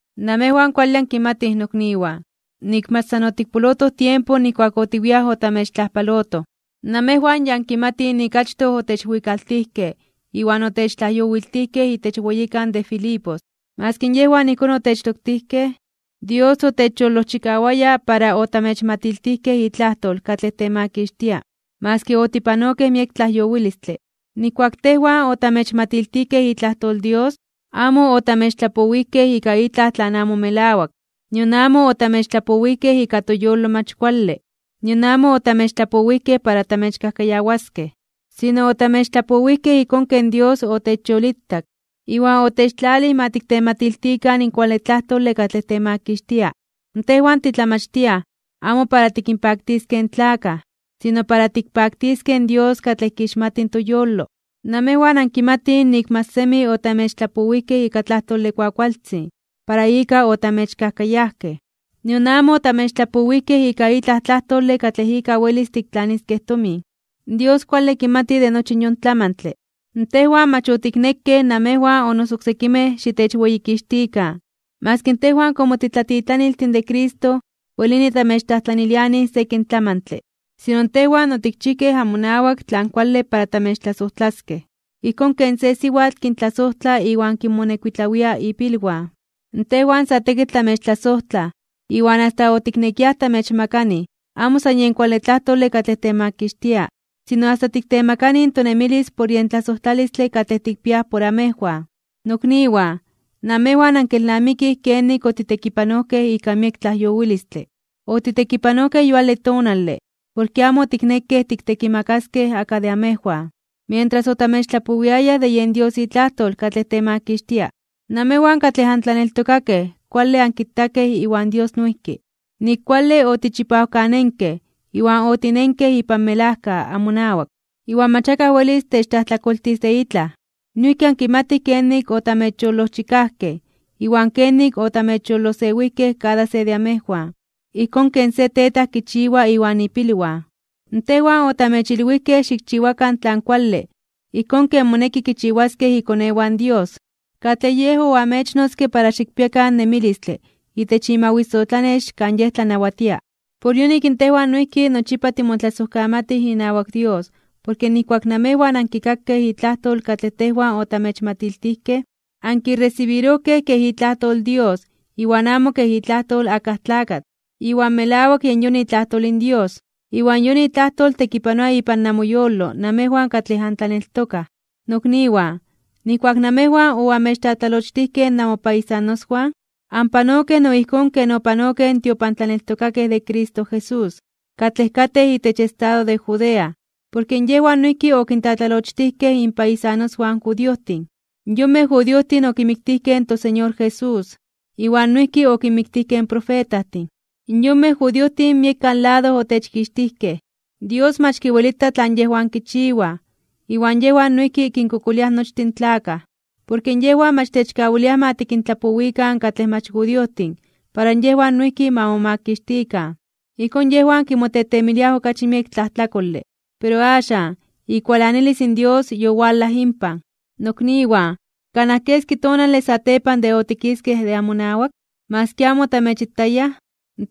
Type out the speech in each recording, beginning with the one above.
Namejwan kuale ankimatij, nokniwan, nik mach san otikpolotoj tiempo nijkuak otiwiaj otamechtlajpalotoj. Namejwan ya ankimatij nik achtoj otechwikaltijkej iwan otechtlajyowiltijkej itech weyikan de Filipos. Maski yejwan ijkón otechtoktijkej, Dios otechyolojchikawaya para otamechmatiltijkej itlajtol katlej temakixtia, maski otipanokej miek tlajyowilistle. Nijkuak tejwan otamechmatiltijkej itlajtol in Dios amo otamechtlapowijkej ika itlaj tlan amo melawak, nion amo otamechtlapowijkej ika toyolo mach kuale, nion amo otamechtlapowijkej para tamechkajkayawaskej. Sino, otamechtlapowijkej ijkón ken Dios otechyolitak iwan otechtlalij ma tiktematiltikan in kuale tlajtole katlej temakixtia. Tejwan titlamachtiaj amo para tikinpaktiskej in tlakaj, sino para tikpaktiskej in Dios katlej kixmati in toyolo. Namejwan ankimatij nik mach semi otamechtlapowijkej ika tlajtole kuakualtzin para ika otamechkajkayajkej, nion amo otamechtlapowijkej ika itlaj tlajtole katlej ika welis tiktlaniskej tomin. Dios kuale kimati de nochi yon tlamantle. Tejwan mach otiknekej namejwan o noso oksekimej xitechweyikixtikan, maski tejwan komo titlatitlaniltin de Cristo welini tamechtlajtlanilianij sekin tlamantle. Sino tejwan otikchijkej amonawak tlan kuale para tamechtlasojtlaskej ijkón ken se siwatl kintlasojtla iwan kinmonekuitlawia ipilwan. Tejwan sa tekitl tamechtlasojtlaj iwan asta otiknekiaj tamechmakanij, amo san yen kuale tlajtole katlej temakixtia, sino asta tiktemakanij in tonemilis por yen tlasojtlalistle katlej tikpiaj por amejwan. Nokniwan, namejwan ankelnamikij kenik otitekipanojkej ika miek tlajyowilistle. Otitekipanojkej yuale tonale porke amo otiknekej tiktekimakaskej akaj de amejwan, mientras otamechtlapowiayaj de yen Dios itlajtol katlej temakixtia. Namejwan katlej antlaneltokakej kuale ankitakej iwan Dios noijki, nik kuale otichipawkanenkej iwan otinenkej ipan melajka amonawak, iwan mach akaj welis techtlajtlakoltis de itlaj. Noijki ankimatij kenik otamechyolojchikajkej iwan kenik otamechyolosewijkej kada se de amejwan, ijkón ken se tetaj kichiwa iwan ipilwan. Tejwan otamechilwijkej xikchiwakan tlan kuale ijkón ken moneki kichiwaskej ikonewan in Dios, katlej Yej oamechnotzke para xikpiakan nemilistle itech imawisotlanex kan Yej tlanawatia. Por yonik tejwan noijki nochipa timotlasojkamatij inawak Dios porke nijkuak namejwan ankikakej itlajtol katlej tejwan otamechmatiltijkej, ankiresibirojkej kej itlajtol in Dios iwan amo kej itlajtol akaj tlakatl. Iwan melawak yen yon itlajtol in Dios. Iwan yon itlajtol tekipanoa ipan namoyolo namejwan katlej antlaneltokaj. Nokniwan, nijkuak namejwan oamechtlatlalochtijkej namopaisanoswan, anpanokej no ijkón ken opanokej in tiopantlaneltokakej de Cristo Jesús, katlej katej itech estado de Judea, porke yejwan noijki okintlatlalochtijkej inpaisanoswan in judiojtin. Yonmej judiojtin okimiktijkej in toSeñor Jesús, iwan noijki okinmiktijkej in profetajtin. In yonmej judiojtin miekan lado otechkixtijkej. Dios mach kiwelita tlan yejwan kichiwaj iwan yejwan noijki kinkokoliaj nochtin in tlakaj. Porke yejwan mach techkawiliaj ma tikintlapowikan katlej mach judiojtin para yejwan noijki ma momakixtikan. Ijkón yejwan kimotetemiliaj okachi miek tlajtlakole. Pero axan, ikualanilis in Dios yowalaj inpan. Nokniwan, kanaj keski tonale satepan de otikiskej de amonawak, maski amo otamechitayaj,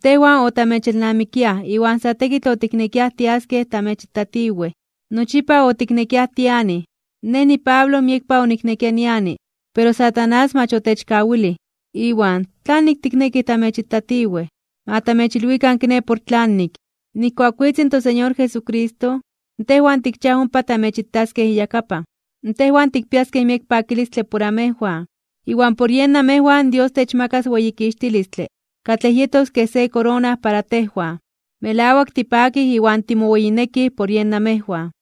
tejwan otamechelnamikiaj iwan sa tekitl otiknekiaj tiaskej tamechitatiwej. Nochipa otiknekiaj tianij, nej niPablo miekpa oniknekia niani, pero Satanás mach otechkawilij. Iwan, ¿tlanik tiknekij tamechitatiwej? Ma tamechilwikan kiné por tlanik. Nijkuak witz in toSeñor Jesucristo, tejwan tikchiaj ompa tamechitaskej iyakapan. Tejwan tikpiaskej miek pakilistle por amejwan. Iwan por yen namejwan Dios techmakas weyikixtilistle katlej yetos kej se korona para tejwan. Melawak tipakij iwan timoweyinekij por yen namejwan.